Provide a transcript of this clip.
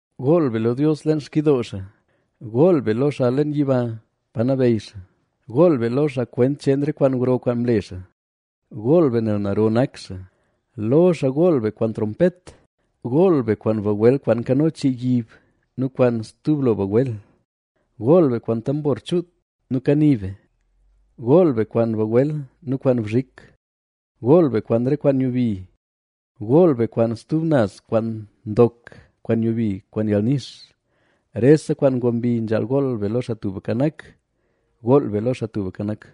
Gool be lo Dios leen xkidoo xaa; gool be lo xaa leen yiba pa nabeyy xaa. Gool be lo xaa kwent cheen re kwaan gro kwaan mle xaa; gool be nel naro nak xaa. Lo xaa gool be kwaan trompet; gool be kwaan bagwel kwaan nkano chii yib nu kwaan stub lo bagwel. Gool be kwaan tambor chuut nu kani be; gool be kwaan bagwel nu kwaan bzhik. Gool be kwaan re kwaan nyubi; gool be kwaan stub kwaan ndok kwaan nyubi kwaan yalnix. Rese kwaan ngob mbi nzhaal gool be lo Xaa Tubka Nak. ¡Gool be lo Xaa Tubka Nak!